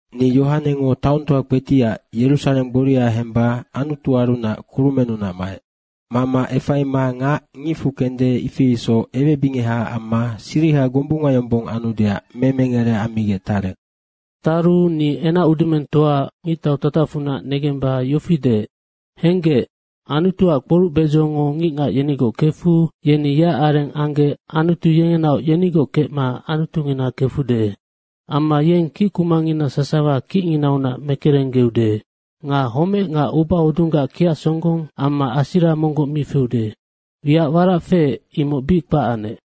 Ni Yohanengo taongtoa kpetiac, Yerusareng gboria hemba Anutuarunac kurumennunac maec. Mama efaima ngac ngicfu kende, ifi isoc ewebingehaac amma siriha gombunga yombong anudeac memengere ammigec tarec. Taru ni enacudumengtoa ngictau tatacfunac negemba yofi deec, “Henggec Anutuac kporucbedzongo ngicngac yenigoc kefu yeni yeac areng anggec Anutu yengenaoc yenigoc kecma Anutungina kefude. Amma yeng kickumangina sasawa kicnginaunac mekerenggeude. Nga homec nga ubahodunggac kiacsonggong amma asira monggoc mi feude. Wiac warac feec, imoc bic kpac anec.”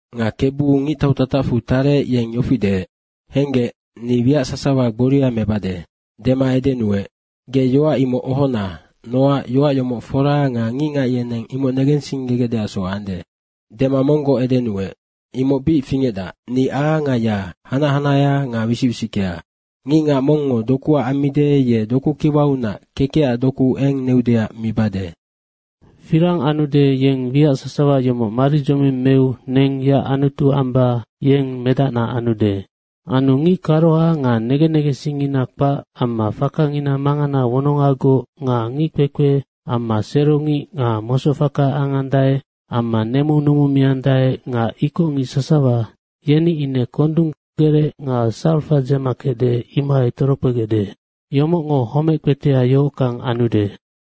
Nga Kebu ngictau tatacfu tarec, yeng yofi deec, “Henggec, ni wiac sasawa gboria mebade.” dema edenuec, “Ge yoac imoc ohona nocac yoac yomoc fora nga ngicngac yeneng imoc negensinggegecdeacsoc ande.” Dema monggoc edenuec, “Imoc bic fingecdac. Ni A nga Y, hanac hanahea nga wisic wisickea. Ngicngac mongngo dokuac ammide, ye dokukiwaunac kekecac doku eng neudeac mibade. Firang anude, yeng wiac sasawa yomoc maridzoming meu neng yeac Anutu amba yeng medacna anude. Anu ngic karoha nga negen negensingngina kpac amma fakangina mangana wonongagoc nga ngickpekpe amma serongic nga mosocfaka angandae amma nemu numumiandae nga ikocngic sasawa, yeni ine kondung gerec nga sarafa dzema kecde, imohai torokpegecde. Yomocngo homec kpetea yohockang anude.”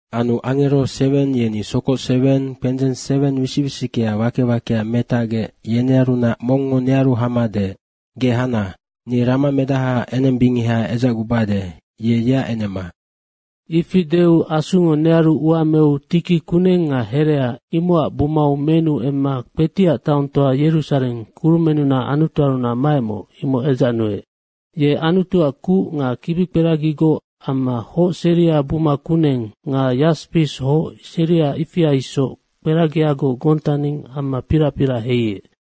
Anu angero seweng yeni sokoc seweng kpendzeng seweng wisic wisickea wake wakea metacgec, yenearunac mongngo nearu hama deec, “Ge hana, ni ramamedahaac enembingeha edzacgubade, ye yeac enema.” Ifi deu Asungo nearu ua meu tiki kuneng nga herea, imocac bumau menu emma kpetiac taongtoa Yerusareng, kurumennunac Anutuarunac maecmoc, imoc edzacnuec. Ye Anutuac kuc nga kibikperagigoc amma hoc seria buma kuneng nga yaspis hoc seria, ifia isoc kperagiagoc gontaning amma pirac pirac heiec.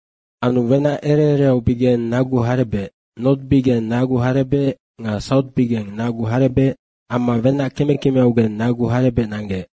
Anu wenac ere ereaubigeng nagu harebec, nortbigeng nagu harebec nga sautbigeng nagu harebec amma wenac keme kemeaugeng nagu harebec nanggec.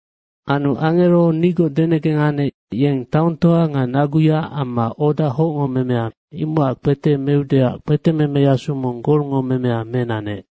Anu angero nigoc denegeng anec, yeng taongtoa nga naguya amma oda hocngo memea, imocac kpete meudeac kpetememeyasu mong golngo memea menanec.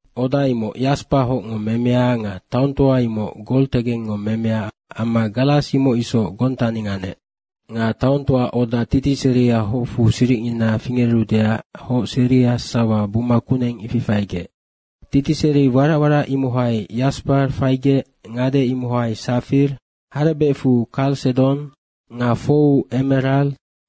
Oda imoc yaspa hocngo memea nga taongtoa imoc gol tegengngo memea amma garas imoc isoc gontaning anec. Nga taongtoaac oda titiseria hocfu siricngina fingerudeac hoc seria sasawa buma kuneng, ifi faigec. Titiseri warac warac imohai yaspa faigec, ngade, imohai sapaia, harebecfu karsedong nga 4u emerare,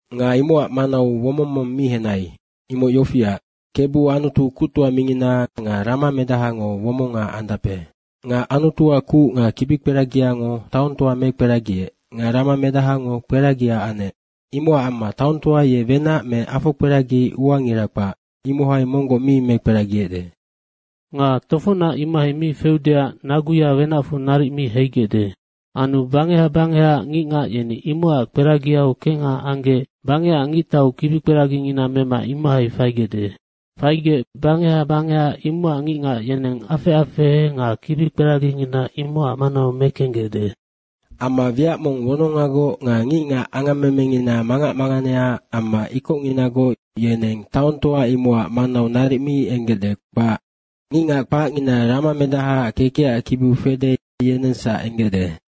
Nga imocac manau womong mong mi henai. Imoc yofiac, Kebu Anutu kuctoa mingina nga ramamedahango womonga andape. Nga Anutuac kuc nga kibikperagiango taongtoa mekperagiec nga ramamedahango kperagia anec. Imocac amma taongtoa ye wenac me afokperagi uangira kpac, imohai monggoc mi mekperagiecde. Nga tofocnac imohai mi feudeac naguya wenacfu naric mi heigecde. Anu bangeha bangehaac ngicngac yeni imocac kperagiau kengha anggec bangecac ngictau kibikperagingina mema imohai faigecde. Faigec bangeha bangeha, imocac ngicngac yeneng afec afehe nga kibikperagingina imocac manau mekenggecde. Amma wiac mong wonongagoc nga ngicngac angammemengina mangac manganea amma ikocnginagoc, yeneng taongtoa imocac manau naric mi enggecde, kpac. Ngicngac kpacngina ramamedahaac kekecac kibiu fede, yenengsac enggecde.